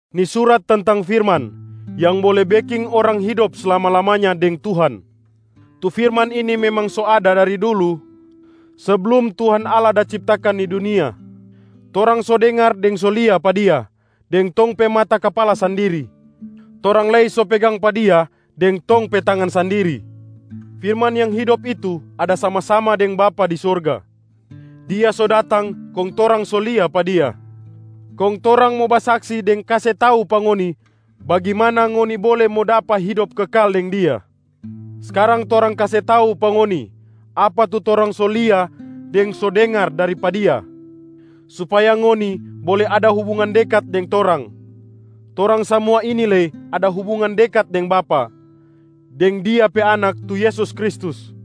Ni surat tentang firman yang bole beking orang hidop slama-lamanya deng Tuhan. Tu firman ini memang so ada dari dulu seblum Tuhan Allah da ciptakan ni dunia. Torang so dengar deng so lia pa Dia deng tong pe mata kapala sandiri, torang lei so pegang pa Dia deng tong pe tangan sandiri. Firman yang hidop itu ada sama-sama deng Bapa di sorga. Dia so datang kong torang so lia pa Dia. Kong torang mo basaksi deng kase tau pa ngoni bagimana ngoni bole mo dapa hidop kekal deng Dia. Skarang torang kase tau pa ngoni apa tu torang so lia deng so dengar dari pa Dia supaya ngoni bole ada hubungan dekat deng torang. Torang samua ini lei ada hubungan dekat deng Bapa, deng Dia pe Anak tu Yesus Kristus.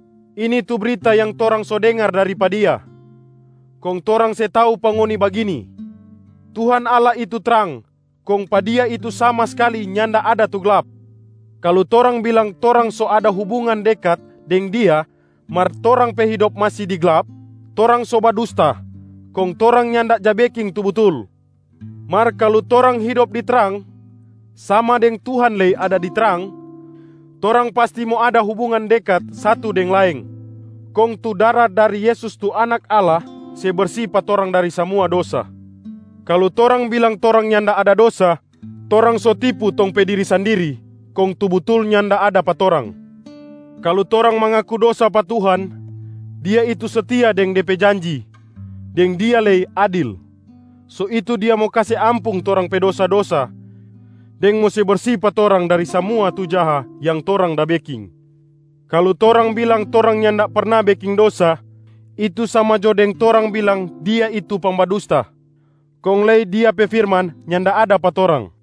Ini tu brita yang torang so dengar dari pa Dia, kong torang se tau pa ngoni bagini: Tuhan Allah itu trang kong pa Dia itu sama skali nyanda ada tu glap. Kalu torang bilang torang so ada hubungan dekat deng Dia mar torang pe hidop masi di glap, torang so badusta kong torang nyanda ja beking tu butul. Mar kalu torang hidop di trang, sama deng Tuhan lei ada di trang, torang pasti mo ada hubungan dekat satu deng laeng, kong tu dara dari Yesus tu Anak Allah se bersi pa torang dari samua dosa. Kalu torang bilang torang nyanda ada dosa, torang so tipu tong pe diri sandiri kong tu butul nyanda ada pa torang. Kalu torang mangaku dosa pa Tuhan, Dia itu setia deng Dia pe janji deng Dia lei adil, so itu Dia mo kase ampung torang pe dosa-dosa deng mo se bersi pa torang dari samua tu jaha yang torang da beking. Kalu torang bilang torang nyanda perna beking dosa, itu sama jo deng torang bilang Dia itu pangbadusta kong lei Dia pe firman nyanda ada pa torang.